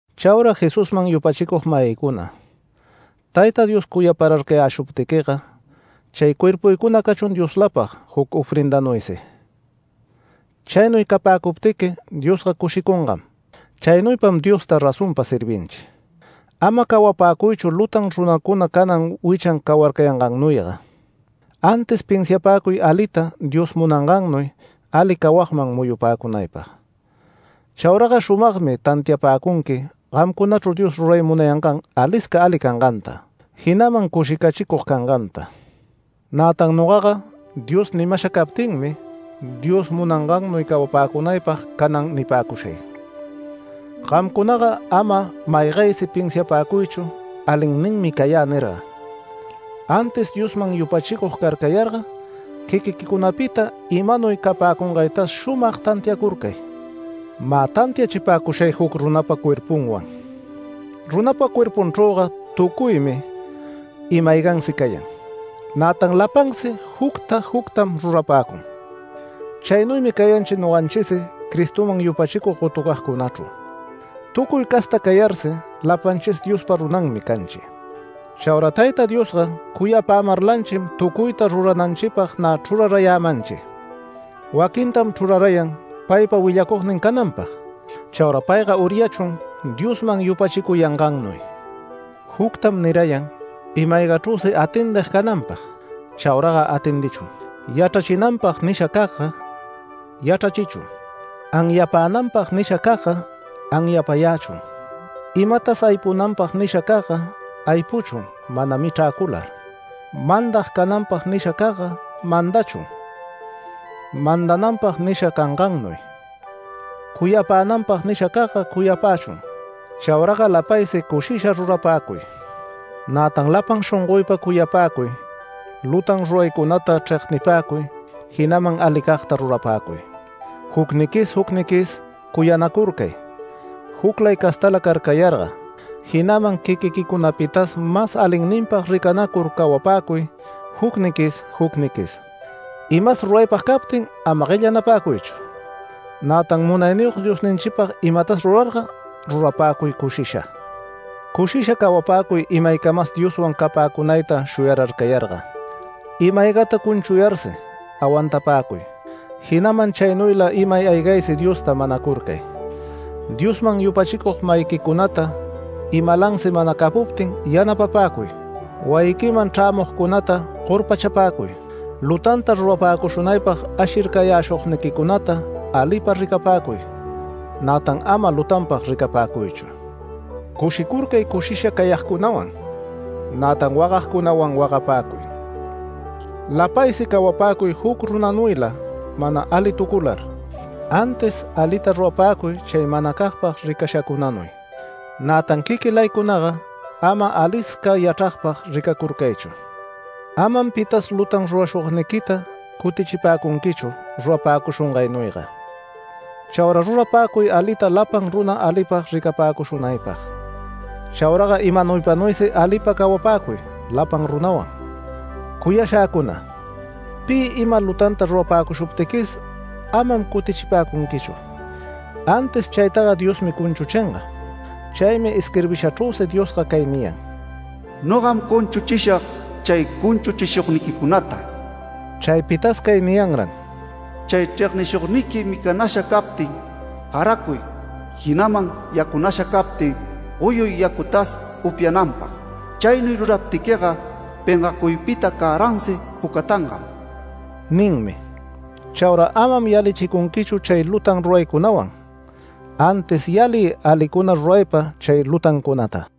Chauraga Jesusman yupachicug-mayïcuna, Tayta Dios cuyapararcayäshuptiquiga, chay cuerpuycuna cachun Dioslapag juc ofrendanuysi. Chaynuy capäcuptiqui Diosga cushicungam. Chaynuypam Diosta razonpa servinchi. Ama cawapäcuychu lutan runacuna canan wichan cawarcayangannuyga. Antis pinsiapäcuy alita Dios munangannuy ali cawagman muyupäcunaypag. Chauraga shumagmi tantiapäcunqui gamcunachru Dios ruray munayangan alisca ali canganta, jinaman cushicachicug canganta. Nätan nogaga Dios nimasha captinmi Dios munangannuy cawapäcunaypag canan nipäcushay: Gamcunaga ama maygaysi pinsiapäcuychu “Alinninmi cayä” nirga, antis Diosman yupachicug carcayarga quiquiquicunapita imanuy capäcungaytas shumag tantiacurcay. Mä tantiachipäcushay juc runapa cuerpunwan: Runapa cuerpunchrüga tucuymi ima-aygansi cayan. Nätan lapansi jucta juctam rurapäcun. Chaynuymi cayanchi noganchisi Cristoman yupachicug gotucagcunachru. Tucuy casta cayarsi lapanchis Diospa runanmi canchi. Chaura Tayta Diosga cuyapämarlanchim tucuyta rurananchipag nä chrurarayämanchi. Waquintam chrurayan paypa willacugnin cananpag, chaura payga uryachun Diosman yupachicuyangannuy. Juctam nirayan ima-aygachrüsi atendig cananpag chauraga atendichun; yachrachinanpag nishacagga yachrachichun; anyapänanpag nishacagga anyapayächun; imatas aypunanpag nishacagga aypuchun mana michräcular; mandag cananpag nishacagga mandachun mandananpag nisha cangannuy; cuyapänanpag nishacagga cuyapächun. Chauraga lapaysi cushisha rurapäcuy. Nätan lapan shongoypa cuyapäcuy, lutan ruraycunata chregnipäcuy, jinaman alicagta rurapäcuy. Jucniquis jucniquis cuyanacurcay juclay castala carcayarga, jinaman quiquiquicunapitas mas alinninpag ricanacur cawapäcuy jucniquis jucniquis. Imas ruraypag captin ama guellanapäcuychu. Nätan munayniyog Diosninchipag imatas rurarga rurapäcuy cushisha. Cushisha cawapäcuy imaycamas Dioswan capäcunayta shuyararcayarga, ima-aygata cunchuyarsi awantapäcuy, jinaman chaynuyla imay aygaysi Diosta manacurcay. Diosman yupachicug-mayiquicunata imalansi mana capuptin yanapapäcuy. Wayiquiman chrämugcunata gorpachapäcuy. Lutanta rurapäcushunaypag ashircayäshugniquicunata alipa ricapäcuy, nätan ama lutanpag ricapäcuychu. Cushicurcay, cushisha cayagcunawan. Nätan wagagcunawan wagapäcuy. Lapaysi cawapäcuy juc runanuyla mana alitucular, antis alita rurapäcuy chay manacagpag ricashacunanuy. Nätan quiquilaycunaga ama alisca yachragpag ricacurcaychu. Amam pitas lutan rurashugniquita cutichipäcunquichu rurapäcushungaynuyga. Chaura rurapäcuy alita lapan runa alipag ricapäcushunaypag. Chauraga imanaypanuysi alipa cawapäcuy lapan runawan. Cuyashäcuna, pi ima lutanta rurapäcushuptiquis, amam cutichipäcunquichu, antis chaytaga Diosmi cunchuchinga. Chaymi isquirbishachrüsi Diosga cay niyan: “Nogam cunchuchishag chay cunchuchishugniquicunata”. Chaypitas cay niyanran: “Chay chregnishugniqui micanasha captin, garacuy, jinaman yacunasha captin goyuy yacutas upyananpag. Chaynuy ruraptiquiga pengacuypita cäransi pucatangam” ninmi. Chaura amam yalichicunquichu chay lutan ruraycunawan, antis yaliy alicuna ruraypa chay lutancunata.